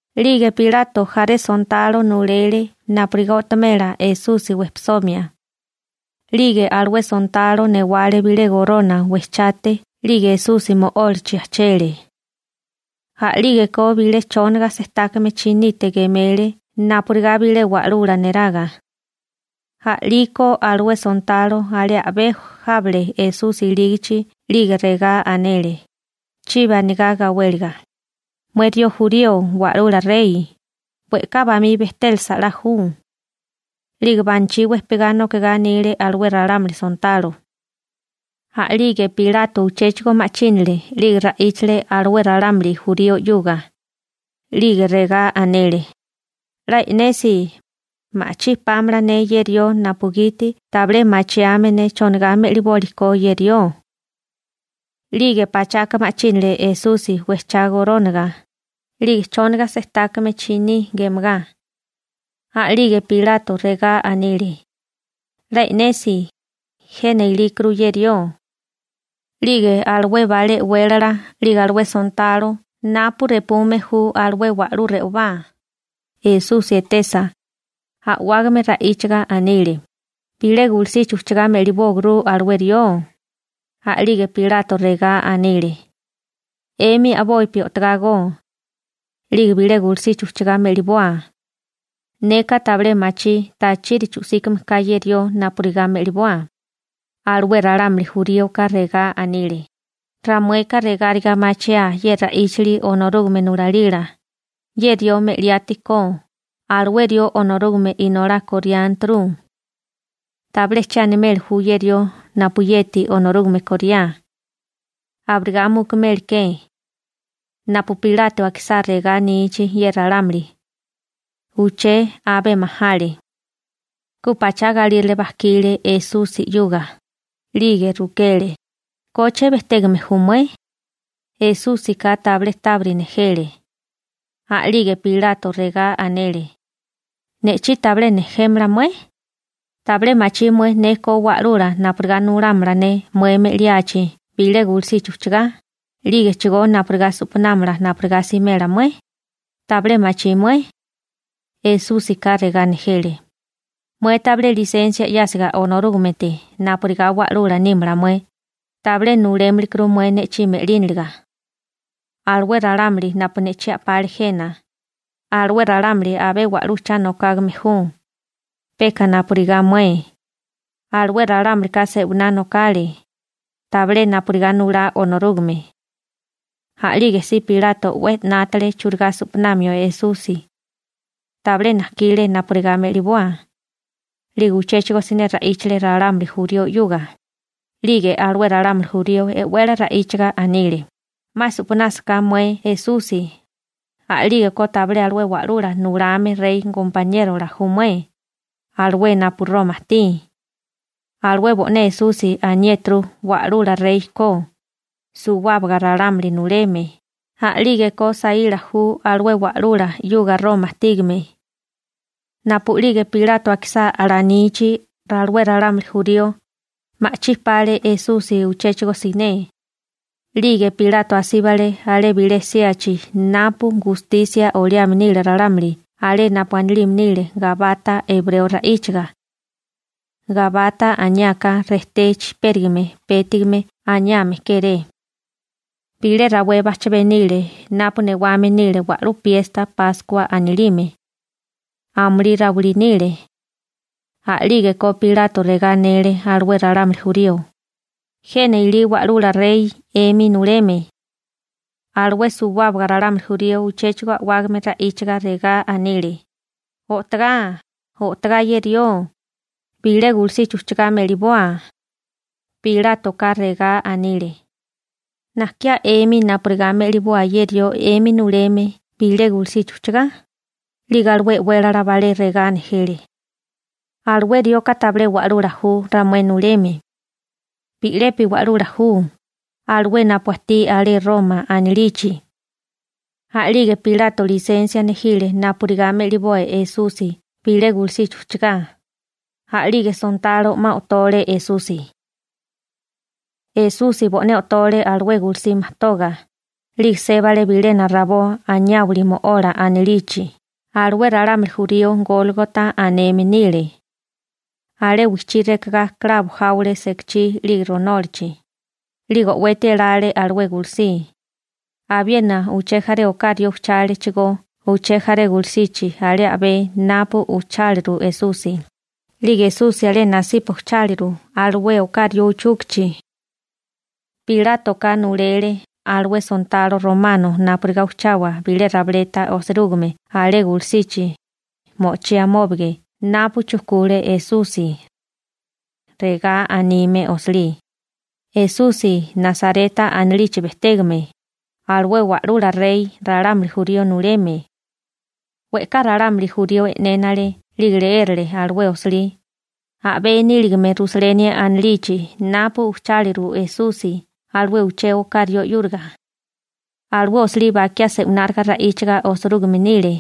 'Lige Pilato jaré sontalo nulele napurigá o'tomela Esusi wejpisomia. 'Lige alué sontalo newale bilé gorona wejchate 'lige Esusi mo'ólachi ajchele. A'lígeko bilé chónaga sejtákame chinite gemele napurigá bilé wa'lula neraga. A'liko alué sontalo alé a'bé jábale Esusi ilígichi 'lige regá anele, chibi anigá gawéliga: ―¡Mué rió jurío Wa'lula Rey, we'ká bamí bejtélasa 'la ju! 'Lige banachí wejpigá nokigá anile alué ralámuli sontalo. A'lige Pilato uchéchigo ma'chínale 'lige ra'íchale alué ralámuli jurío 'yuga, 'lige regá anele: ―'La e'nesi, ma'chí pámala ne ye rió napugiti tabilé machiame ne chonigá me'liboli ko ye rió. 'Lige pachaka ma'chínale Esusi wejchá gorónaga, 'lige chónaga sejtákame chiní gemagá. A'lige Pilato regá anile: ―¡'La e'nesi, jena ilíkuru ye rió! 'Lige alué balé e'wélala 'lige alué sontalo napu repume ju alué wa'lú re'obá, Esusi etesa, a'wágame ra'íchaga anile: ―¡Bilé gulusichi ujchugá me'libóguru alué rió! A'lige Pilato regá anile: ―'Emi a'bopi o'togágó. 'Lige bilé gulusichi ujchugá me'liboa. Neka tabilé machí tachiri chu'síkame ka ye rió napurigá me'liboa. Alué ralámuli juríoka regá anile: ―Ramueka regáriga machiaa ye ra'íchali Onorúgame nulalila, ye rió me'liátikó, alué rió Onorúgame Inolá koriánturu. Tabilé che animeli ju ye rió napuyeti Onorúgame koriá. Abirigá mukumeli ke. Napu Pilato akisá regá anichi ye ralámuli, uché abé majale. Ku pachá galírale bajkile Esusi 'yuga, 'lige rukele: ―¿Koche bejtégame ju mué? Esúsika tabilé tábiri nejele. A'lige Pilato regá anele: ―¿Ne'chí tabilé nejémala mué? ¿Tabilé machí mué ne ko wa'lula napurigá nulámala ne mué me'liachi bilé gulusichi ujchugá, 'lige napurigá su'panámala napurigá simela mué? ¿Tabilé machí mué? Esúsika regá nejele: ―Mué tabilé lisensia 'yásiga Onorúgamete napurigá wa'lula nímala mué, tabilé nulémilikuru mué ne'chí me'líniliga. Alué ralámuli napu ne'chí a'pale jena, alué ralámuli abé wa'lú cha nokágame ju, peka napurigá mué. Alué ralámulika se'winá nokale, tabilé napurigá nulá Onorúgame. A'lige si Pilato 'we 'nátale churigá su'panamio Esusi. Tabilé najkile napurigá me'liboa. 'Lige uchéchigo siné ra'íchale ralámuli jurío 'yuga, 'lige alué ralámuli jurío e'wele ra'íchaga anile: ―'Ma su'panásaká mué Esusi, a'lígeko tabilé alué wa'lula nulame rey gompaniérola ju mué, alué napu Roma ajtí. Alué bo'né Esusi aniéturu wa'lula rey ko, suwábaga ralámuli nuleme, a'lígeko saíla ju alué wa'lula 'yuga Roma ajtígame. Napu'lige Pilato akisá alanichi alué ralámuli jurío, ma'chí pale Esusi uchéchigo siné. 'Lige Pilato asíbale alé bilé síachi napu gustisia oliame nile ralámuli alé napu anilime nile Gabata ebreo ra'íchaga. Gabata aniáká «Rejté Chijpérigime Pétigame» aniame kéré. Bilé rawé bajchabé nile napu newame nile wa'lú piesta Páskua anilime. Amulí rawilí nile. A'lígeko Pilato regá anele alué ralámuli jurío: ―¡Jena ilí wa'lula rey 'emi nuleme! Alué suwábaga ralámuli jurío uchéchigo a'wágame ra'íchaga regá anile: ―¡O'togá, o'togá ye rió, bilé gulusichi ujchugá me'liboa! Pilátoka regá anile: ―¿Najkiá 'emi napurigá me'liboa ye rió 'emi nuleme bilé gulusichi ujchugá? 'Lige alué e'wélala balé regá nejele: ―Alué rioka tabilé wa'lula ju ramué nuleme. Bi'lepi wa'lula ju, alué napu ajtí alé Roma anilichi. A'lige Pilato lisensia nejile napurigá me'liboa Esusi bilé gulusichi ujchugá. A'lige sontalo 'ma o'tole Esusi. Esusi bo'né o'tole alué gulusí majtoga, 'lige sébale bilena rabó Anayáwali Mo'ola anilichi. Alué ralámuli jurío Gólgota aneme nile. Alé wijchí rekagá klabo jáwale sekachí 'lige ronólachi, 'lige o'weti elale alué gulusí. Abiena uché jaré oká rió ujchálechigó uché jaré gulusichi alé a'bé napu ujcháliru Esusi, 'lige Esusi alé nasipa ujcháliru alué oká rió uchúkichi. Pilátoka nulele alué sontalo romano napurigá ujchawa bilé rabileta osirúgime alé gulusichi, mo'ochí amóbage napu chujkule Esusi. Regá anime osilí: «Esusi Nasareta anilichi bejtégame, alué wa'lula rey ralámuli jurío nuleme.» We'ká ralámuli jurío e'nénale 'lige leérale alué osilí, a'bé níligame Rusaleni anilichi napu ujcháliru Esusi alué uché oká rió 'yúriga. Alué osilí bakiá se'wináriga ra'íchiga osirúgime nile,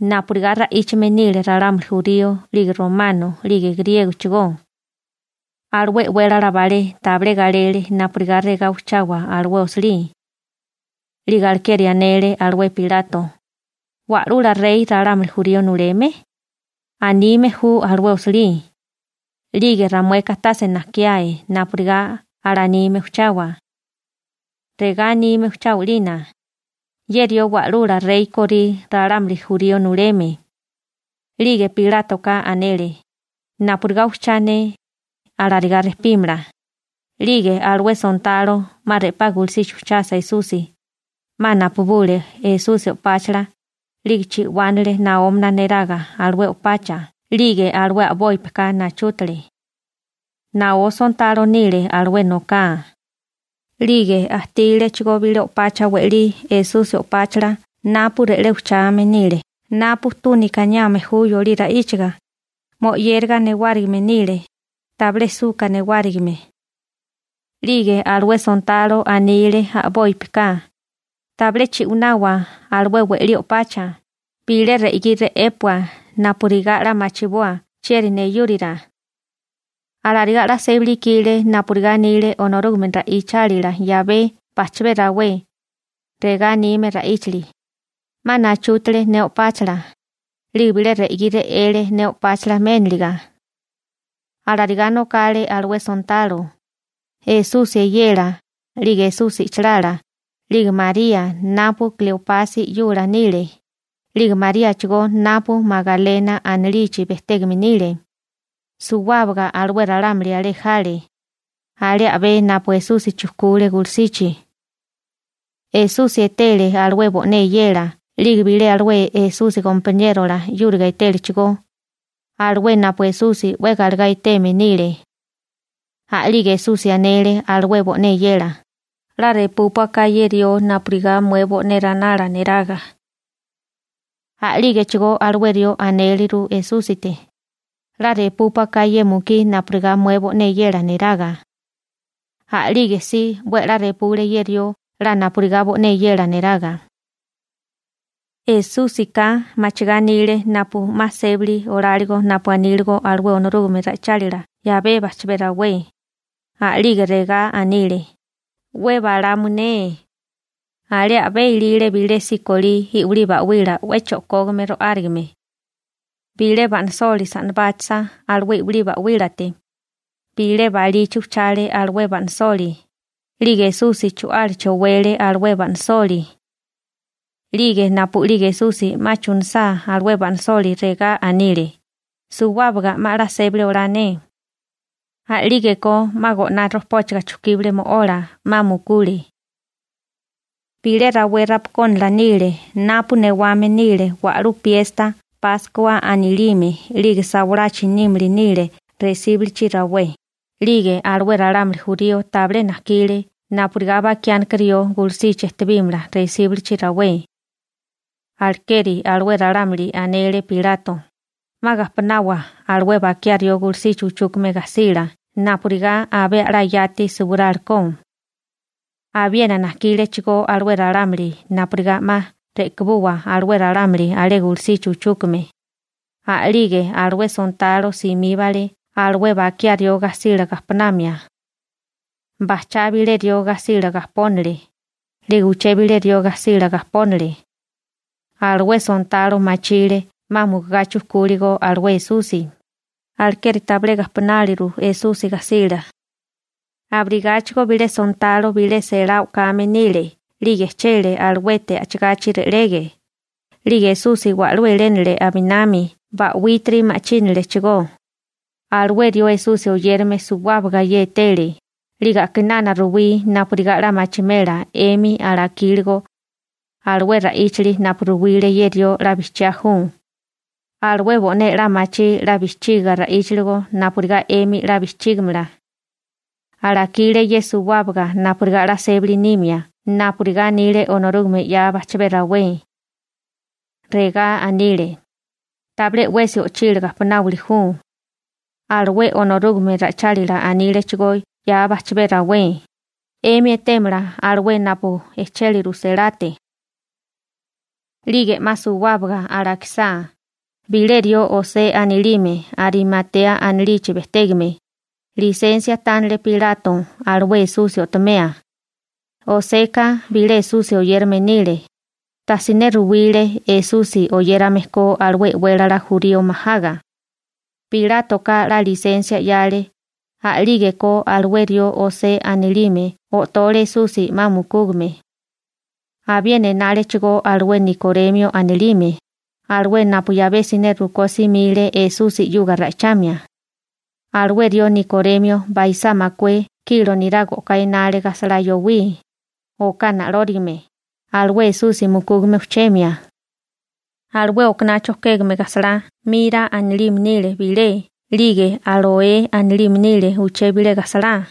napurigá ra'íchame nile ralámuli jurío, 'lige romano, 'lige griégochigó. Alué e'wélala balé tabilé galele napurigá regá ujchawa alué osilí. 'Lige alekeri anele alué Pilato: ―‹‹Wa'lula rey ralámuli jurío nuleme», anime ju alué osilí, 'lige ramueka tase najkiae napurigá alanime ujchawa. Regá anime ujchawa 'lina: «Ye rió Wa'lula rey korí ralámuli jurío nuleme.» 'Lige Pilátoka anele: ―Napurigá ujchá ne, alarigá rejpímala. 'Lige alué sontalo 'ma re'pá gulusichi ujchasa Esusi, 'ma napabule Esusi o'páchala, 'lige chi'wánale naómana neraga alué o'pacha 'lige alué a'bópika nachútale. Naó sontalo nile alué noká. 'Lige ajtílechigó bilé o'pacha we'lí Esusi o'páchala napu re'lé ujchame nile (napu túnika aniame ju yolí ra'íchaga), mo'yériga newárigime nile, tabilé suka newárigime. 'Lige alué sontalo anile a'bópika: ―Tabilé chi'wanawa alué we'lí o'pacha, bilé re'gí re'épua napurigá 'la machiboa chieri neyúrira. Alarigá 'la sébali ikile napurigá anile Onorúgame ra'ichálila 'yabé bajchabé rawé, regá anime ra'íchili: «'Ma nachútale ne o'páchala, 'lige bilé re'gí re'ele ne o'páchala méniliga.» Alarigá nokale alué sontalo. Esusi eyela, 'lige Esusi i'chilala, 'lige María napu Kleopasi 'yula nile, 'lige Maríachigó napu Magalena anilichi bejtégame nile, suwábaga alué ralámuli alé jale, alé a'bé napu Esusi chujkule gulusichi. Esusi etele alué bo'né eyela 'lige bilé alué Esusi gompaniérola 'yúriga etélechigó, alué napu Esusi 'we galegá eteme nile. A'lige Esusi anele alué bo'né eyela: ―'La repúpua ka ye rió napurigá mué bo'né ranala neraga. A'lígechigó alué rió anéleru Esúsite: ―'La repúpua ka ye mukí napurigá mué bo'né eyela neraga. A'lige si 'we a'lá repule ye rió 'la napurigá bo'né eyela neraga. Esúsika machigá anile napu 'ma sébali oláligo napu aníligo alué Onorúgame ra'ichálila 'yabé bajchabé rawé. A'lige regá anile: ―'We balamu ne. Alé a'bé ilile bilé sikolí i'wilí ba'wila 'we cho'kógame ro'árigame. Bilé ba'nasoli sa'nabáchasa alué i'wilí ba'wílate, bilé balichi ujchale alué ba'nasoli, 'lige Esusi chu'álachi owele alué ba'nasoli. 'Lige napu'lige Esusi 'ma chunusá alué ba'nasoli regá anile: ―Suwábaga 'ma 'la sébali olá ne. A'lígeko 'ma go'ná rojpóchiga chujkíbale mo'ola, 'ma mukule. Bilé rawé rapakónala nile napu newame nile wa'lú piesta Páskua anilime 'lige sawalachi nímili nile resíbulichi rawé, 'lige alué ralámuli jurío tabilé najkile napurigá bakiánika rió gulusichi ejtebímala resíbulichi rawé. Alekeri alué ralámuli anele Pilato: ―'Ma gajponawa alué bakiá rió gulusichi uchúkame gajsila napurigá abé a'lá yati suwirálikó. Abiena najkílechigó alué ralámuli napurigá 'ma re'kabuwa alué ralámuli alé gulusichi uchúkame. A'lige alué sontalo simíbale alué bakiá rió gajsila gajponamia. Bajchá bilé rió gajsila gajpónale. 'Lige uché bilé rió gajsila gajpónale. Alué sontalo machile 'ma mukugá chujkúligo alué Esusi, alekeri tabilé gajponáliru Esusi gajsila. Abirigáchigo bilé sontalo bilé selá o'kame nílekó 'lige ejchele aluete a'chigachi re'lege, 'lige Esusi wa'lú elénale aminami ba'wítiri ma'chínalechigó. Alué rió Esusi oyérame suwábaga ye etele, 'lige a'kinana ruwí napurigá 'la machimela 'emi alakíligo. Alué ra'íchali napu ruwile ye rió 'la bijchiá ju. Alué bo'né 'la machí 'la bijchiga ra'íchiligo napurigá 'emi 'la bijchígimala. Alakile ye suwábaga napurigá 'la sébali nimia napurigá anile Onorúgame 'ya bajchabé rawé. Regá anile: «Tabilé 'wesi o'chila gajponáwili ju.» Alué Onorúgame ra'ichálila anílechigó 'ya bajchabé rawé: «'Emi etémala alué napu ejchéliru selate.» 'Lige 'ma suwábaga alakisá, bilé rió José anilime Arimatea anilichi bejtégame, lisensia tánale Pilato alué Esusi o'tomeo. Joseka bilé Esusi oyérame nile, tasiné ruwile Esusi oyérame ko alué e'wélala jurío majaga. Pilátoka 'la lisensia 'yale, a'lígeko alué rió José anilime o'tole Esusi 'ma mukúgame. Abiena enálechigó alué Nikoremio anilime, alué napu 'yabé siné rukó simile Esusi 'yuga ra'ichamia. Alué rió Nikoremio baisá makué kilo niraga o'ká enale gajsalá yowí, oká na'lórigame, alué Esusi mukúgame ujchemia. Alué okaná chojkégame gajsalá «mira» anilime nile bilé 'lige «áloe» anilime nile uché bilé gajsalá.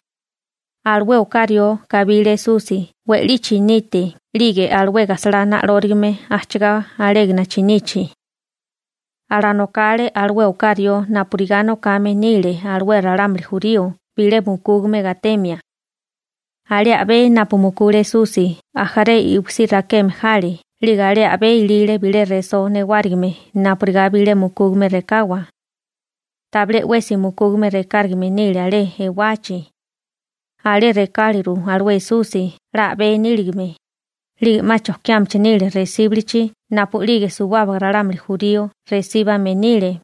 Alué oká rió kabile Esusi we'lí chinite 'lige alué gajsalá na'lórigame ajchigá alégana chinichi. Alanokale alué oká rió napurigá nokame nile alué ralámuli jurío bilé mukúgame gatemia. Alé a'bé napu mukule Esusi ajaré iwisí rakeme jale 'lige alé a'bé ilile bilé resó newárigime napurigá bilé mukúgame rekawa. Tabilé 'wesi mukúgame rekárigame nile alé ewachi. Alé rekáliru alué Esusi 'la a'bé níligame, 'lige 'ma chojkiámichi nile resíbilichi napu'lige suwábaga ralámuli jurío resíbame nile.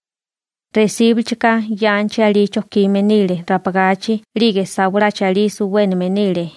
Resíbilichika yanchi alí chojkime nile rapagachi 'lige sawalachi alí suwéname nile.